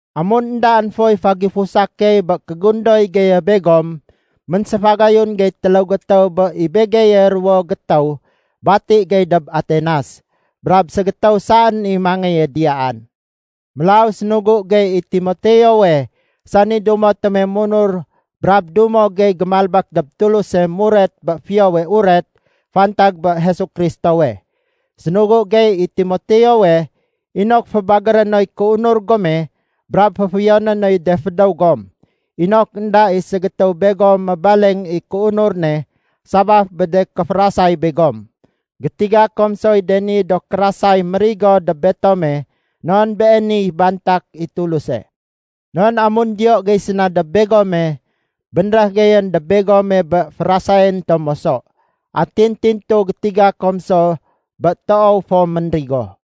Amun éndaén foy fégifusa key bé kégundoy geye begom, ménséfagayun gey téléw gétéw bé i begeye ruwo gétéw bati gey dob Atenas, brab ségétéw saén i mangéye diyaan. Mélaw sénugu gey i Timoteowe, sani dumo tome munur brab dumo gey gémalbék dob Tuluse muret bé Fiyowe Uret fantag bé Jesu Kristowe. Sénugu gey i Timoteowe inok fébagéré noy kéunur gome brab féfiyoné noy de fédéw gom, inok énda i ségétéw begom mébaleng i kéunur ne sabaf bé de kéférasay begom. Gétiga kom soy de ni do kérasay mérigo dob betome non beeniy bantak i Tuluse. Non amun diyo gey séna dob begome, bénréh geyén dob begome bé férasayén tom moso. Atin tintu gétiga kom so bé toow fo ménrigo.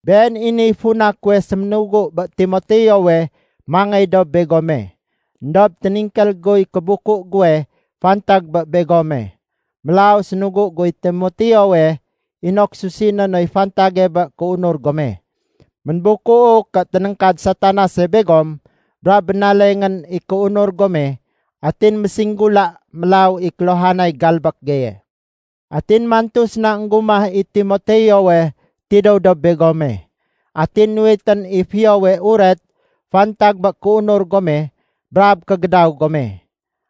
Been i niy funa kuwe séménugu bé Timoteowe mangéy dob begome. Endob téningkél guy kébuku guwe fantag bé begome. Mélaw sénugu guy Timoteowe inok susiné noy fantage bé kéunur gome. Ménbukuu ké ténéngkad Satanase begom brab bénalengén i kéunur gome atin mésinggula mélaw i kéluhanay galbék geye. Atin mantu séna énggumah i Timoteowe tidéw dob begome. Atin nuwitén i fiyowe uret fantag bé kéunur gome brab kégédaw gome.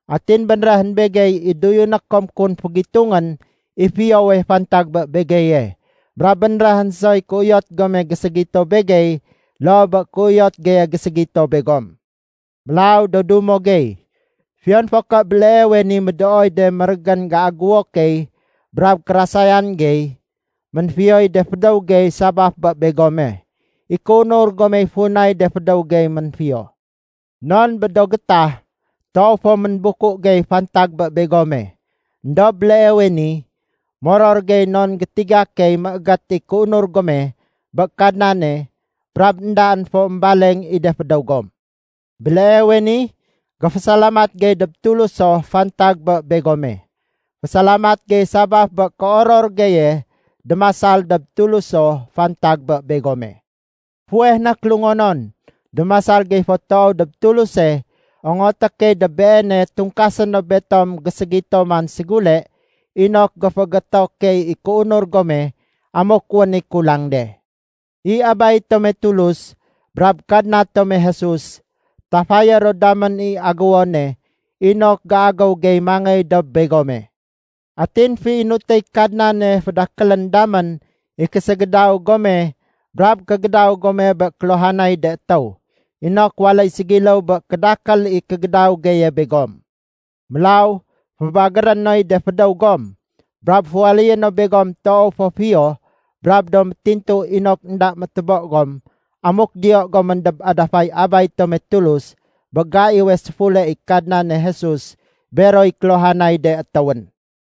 Atin bénréhén begey i doyuné kom kun fégitungén i fiyowe fantag bé begeye. Brab bénréhén soy kéuyot gome géségito begey loo bé kéuyot geye géségito begom. Mélaw do dumo gey, fiyon fo ké béleewe ni médooy de mérégén géagéwo key brab kérasayan gey, ménfiyoy de fédéw gey sabaf bé begome. I kéunur gomey funay de fédéw gey ménfiyo. Non bé do gétah, toow fo ménbuku gey fantag bé begome. Endob béleewe ni, moror gey non gétiga key méégét i kéunur gome bé Kadnane brab éndaén fo émbaleng i de fédéw gom. Béleewe ni, géfésalamat gey dob Tuluso fantag bé begome. Fésalamat gey sabaf bé kéoror geye démasal dob Tuluso fantag bé begome. Fuweh na kélungonon, démasal gey fo toow dob Tuluse ongoté key dob Beene tungkasé no betom géségito man ségule inok géféégéto key i kéunur gome amuk wén i kulang de. I Abay tome Tulus brab Kadna tome Jesus, tafayé ro damén i agéwone inok géagéw gey mangéy dob begome. Atin féinutéy Kadnane fédakélén damén i késégédaw gome brab kégédaw gome bé kéluhanay de étéw, inok waléy ségiléw bé kédakél i kégédaw geye begom. Mélaw fébagéré noy de fédéw gom, brab féwaléyé no begom toow fo fiyo brab do métintu inok énda métébo gom amuk diyo gomén dob adafay Abay tome Tulus bé gaiwe séfule i Kadnane Jesus beroy kéluhanay de étéwén.